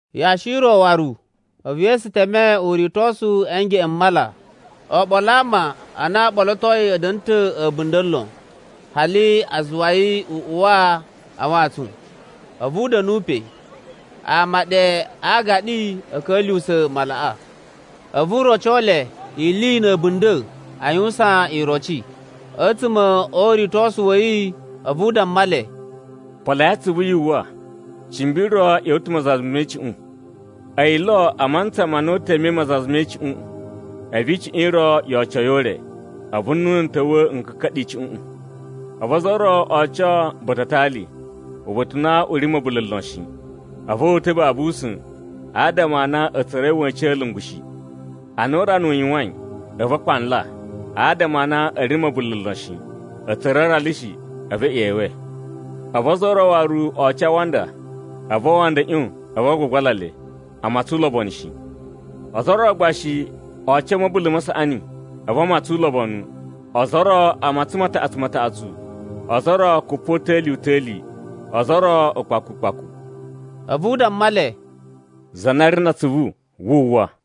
Yashi i ro waru a̱vu Yesu teme uritosu a̱ ngeꞌen m mala. Oɓolo a ama a na o ɓolotoi a̱ da̱na̱ ta̱ a̱bunda̱ lon, hali a zuwa yi u uwa a wantsun, a̱vu u da̱nu pe. Ama ɗe a aagaɗi a̱ ka̱lyuwusa̱ malaꞌa. A̱vu u roco le ili na̱ a̱bunda̱ aa yuwusan iroci. A̱tsuma̱ o uritosu wa̱ yi, a̱vu u damma le, “Poloi atsuvu, yu uwwa, cimbi ro ꞌya̱wa̱ ta̱ mazaza me icuꞌun. A̱yi lo a mantsa ma na u temei mazaza me icuꞌun, a̱vu icuꞌun i ro yo oco yi o ure, a̱vu nnunu n ta̱wa̱ n ka̱ka̱ɗa̱ icuꞌuꞌun. A̱vu ozo o ro o oco ba̱ta̱ a atali, uba̱ta̱ u na u ri na̱ ma̱bula̱ lon shi. A̱vu o uta̱ babu usa̱n, adama a na a̱ tsura̱i wa̱cin a̱lungu shi. Ana urana u yuwain, a̱vu a kpanla, adama a na a̱ ri na̱ ma̱bula̱ lon shi, a̱ tsura̱ aralu shi, a̱vu e ꞌyewe. A̱vu ozo o ro waru o oco a awanda, a̱vu awanda a̱ ꞌyon, a̱vu a gbagbala le, a matsan ulobonu shi. Ozo o ro gba shi o oco a̱ ma̱bula̱ ma saꞌani, a̱vu a matsan ulobonu, ozo o ro a matsan mataꞌatsu mataꞌatsu, ozo o ro kupota̱li-uta̱li, ozo o ro ukpaku ukpaku.” A̱vu u damma le, “Za na ri na atsuvu, wu uwwa.”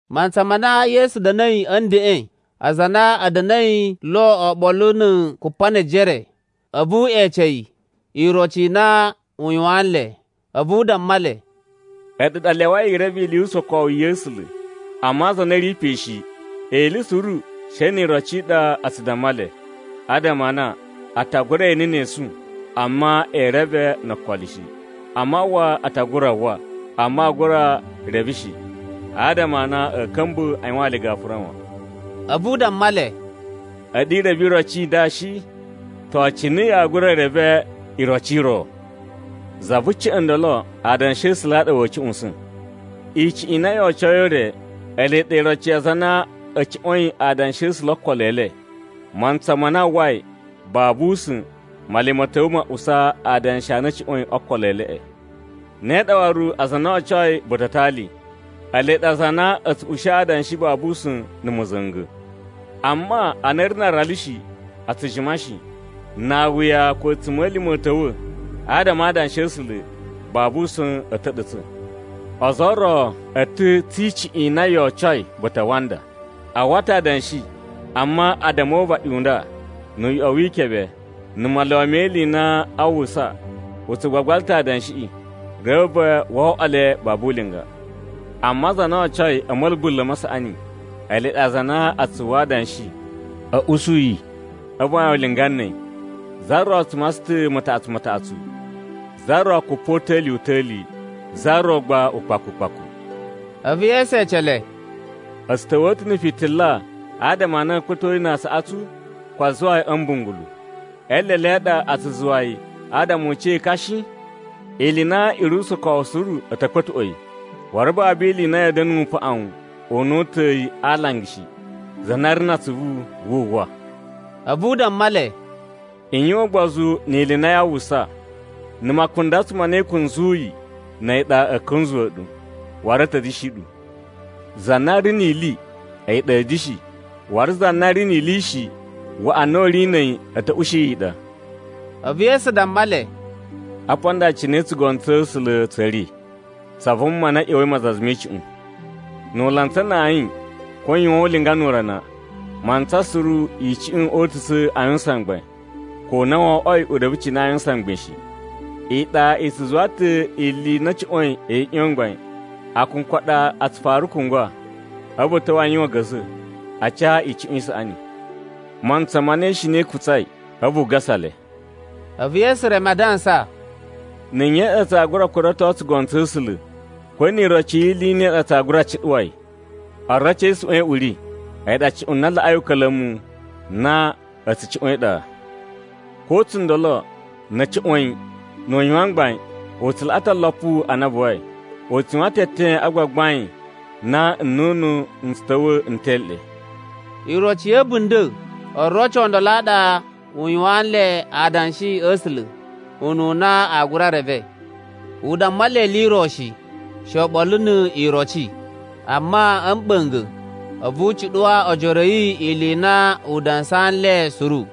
Mantsa ma na Yesu da̱na̱i a̱ ndeꞌen, aza a na a̱ da̱na̱i lo oɓolo na̱ Kupanejere, a̱vu ee ece yi iroci i na u yuwaan nle. A̱vu u damma le, “A̱ɗu ɗa a lyawai i reve ili yu usokowu ya̱ A̱sula̱, amma aza a na a̱ ri pe shi, ili suru she ni iroci i ɗa a tsu damma le. Adama a na ‘A ta gura e ene ne esu, amma ee reve no okolo shi. A mawwa, a ta gura uwwa, amma aa gura reve shi. Adama a na a̱a̱ ka̱mba̱ a yuwaan le gafura wan.’” A̱vu u damma le, “A̱ɗu i reve iroci i nda shi? To, cine yaa gura i reve iroci i ro? Za vu ca̱ꞌa̱n ndolo adanshi a̱ A̱sula̱ ɗa wa̱a̱ cuꞌusa̱n. Icuꞌun i na yo ocoi o ure, ele ɗa iroci ya aza a na a̱ cuꞌwa̱in adanshi a̱ A̱sula̱ o okolo e le. Mantsa ma na a uwwai, babu usa̱n, Male ma̱ ta̱wa̱ ma usa adanshi a na a̱ cuꞌwa̱in o okolo e leꞌe. Ne ɗa waru aza a na o ocoi ba̱ta̱ a atali. Ele ɗa aza a na a̱ tsu ushi adanshi babu usa̱n na̱ ma̱za̱nga̱. Amma ana a̱ ri na aralu shi, a tsu jima shi. Na awuya ko a̱tsuma̱lima̱ a̱ ta̱wa̱ adama a adanshi a̱ A̱sula̱, babu usa̱n a̱a̱ ta̱ɗa̱tsa̱. Ozo o ro a̱ ta̱ tsi icuꞌun i na yo ocoi ba̱ta̱ a awanda. A uwwa ta̱ adanshi, amma addama o uvaɗi u nda, nu uyoꞌo wi ikebe, na maluwa me ili ma na aa uwwusa, a tsu gbagbala ta̱ adanshiꞌi. Reve wo oꞌwo le babu ulinga. Amma aza a na o ocoi a̱ ma̱bula̱ ma saꞌani, ele ɗa aza a na a tsu uwwa adanshi, a̱ usu yi, a̱vu a yuwan ulinga na̱ a̱yi. Za ro tsu matsan ta̱ mataꞌatsu mataꞌatsu, za ro kupota̱li-uta̱li, za ro gba ukpaku ukpaku.” A̱vu Yesu ece le, “A̱ tsu ta̱wa̱a̱ ta̱ na̱ fitila adama a na a̱a̱ kpa̱to yi na aasaꞌatsu, ko a zuwa yi a̱ mbungulu? E eelele a ɗa a tsu zuwa yi, adama u ca ekan shi? Ili i na i ri usokowu suru a̱ ta̱ kpa̱tuꞌwa̱ yi, waru babu ili i na ya̱a̱ da̱na̱ upaꞌun u na o uta̱a̱ yi a alanga shi. Za na ri na atsuvu, wu uwwa.” A̱vu u damma le, “I yuwan ugbozu ni ili i na yaa uwwusa. Na̱ makundatsu ma na i kunzuyi na̱ a̱yi ɗa a̱a̱ kunzuwa̱ ɗu, waru a̱ ta̱ da̱shi ɗu. Za na ri ni ili, a̱yi ɗa a̱a̱ da̱shi, waru za na ri ni ili shi, waꞌa na u ri na̱ a̱yi a̱ ta̱ ushi yi i ɗa.” A̱vu Yesu damma le, “Apa nda cine tsugono tsa̱ A̱sula̱ tsa̱ ri: tsa vuma na ꞌya̱wa̱i mazaza me icuꞌun. Nu u lantsa na ayin ko u yuwan ulinga nu urana, mantsa suru icuꞌun oo utusa̱ a yuwusan mgbain, ko na wo oꞌwoi u reve cine aa yuwusan mgbain shi. Iɗa i tsu zuwa ta̱ ili i na a̱ cuꞌwa̱in i ꞌyon mgbain, akunku a ɗa a tsu fara kungwa, a̱vu a̱ ta̱wa̱ a yuwan a̱ga̱za̱ a ca icuꞌun i saꞌani. Mantsa ma na ishina i kutsai, a̱vu u gasa le.” A̱vu Yesu reme a dansa, “Na̱ nye tsaa gura kurato tsugono tsa̱ A̱sula̱? Ko ni iroci yi ili i ne a gura cuɗuwa yi? Oroci e isuꞌwan i uri, a̱yi ɗa cuꞌun na laꞌai uka̱la̱mu na a̱ tsu cuꞌwa̱n e iɗa. Ko tsundolo, na̱ a̱ cuꞌwa̱n yi, nu u yuwan mgbain, u tsu laꞌa ta̱ olopu a na a buwai, u tsu yuwan ta̱ eten a gbagbain na nnunu n tsu ta̱wa̱ n tele ɗe.” Iroci ya̱ a̱bunda̱ oroci o ndolo a ɗa u yuwaan le adanshi a̱ A̱sula̱, ununa aa gura reve. U damma le ili i ro shi, she oɓolo ni iroci, amma a̱ mɓa̱nga̱, a̱vu u cuɗuwa ojoro a̱ yi ili i na u dansaa nle suru.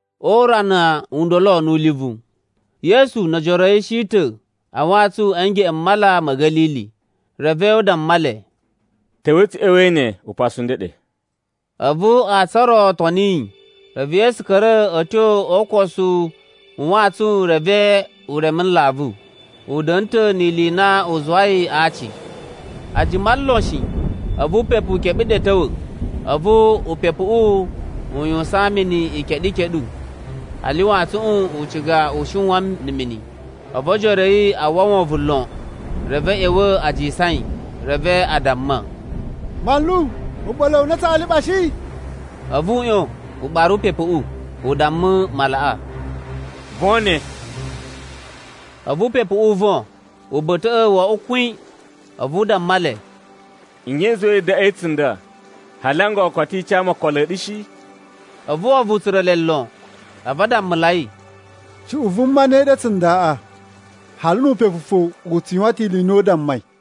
O urana u ndolo nu ulivu, Yesu no ojoro a̱ yi shi ta̱ a wantsun a̱ ngeꞌen m Mala ma̱ Ga̱lili. Reve u damma le, “Ta̱wa̱i tsu ꞌya̱wa̱i ne upasu u ndeɗe.” A̱vu antsun o ro o toni yi. Reve Yesu ka̱ra̱ a̱ tyo o ukosu u wantsun reve u reme nlavu. U da̱na̱ ta̱ ni ili i na u zuwai aaci. A jima lon shi, a̱vu upepu u keɓe ɗe a̱ ta̱wa̱. A̱vu upepuꞌu u yuwusan mini ikeɗu ikeɗu, hali wantsuꞌun u ciga u shiwan na̱ mini. A̱vu ojoro a̱ yi a uwwa wovon lon, reve a̱ ꞌya̱wa̱ a jisan yi. Reve a damma, “Manlu, u ɓa̱la̱ wu a na tsaa liɓa shi?” A̱vu u ꞌyon, u ɓara upepuꞌu, u damma malaꞌa, “Von ne.” A̱vu upepuꞌu u von uba̱ta̱ wo oꞌwo kwin. A̱vu u damma le, “Nye i zuwai yi daꞌwain tsunda, hali n gogo koto i ca mu okolo a̱ ɗu shi?” A̱vu wovon u tsura̱ le lon, a̱vu a dammulai, “Cuꞌun vuma ne ɗa tsundaꞌa, hali nu upepu fo u tsu yuwan ta̱ ili i na u dammai?”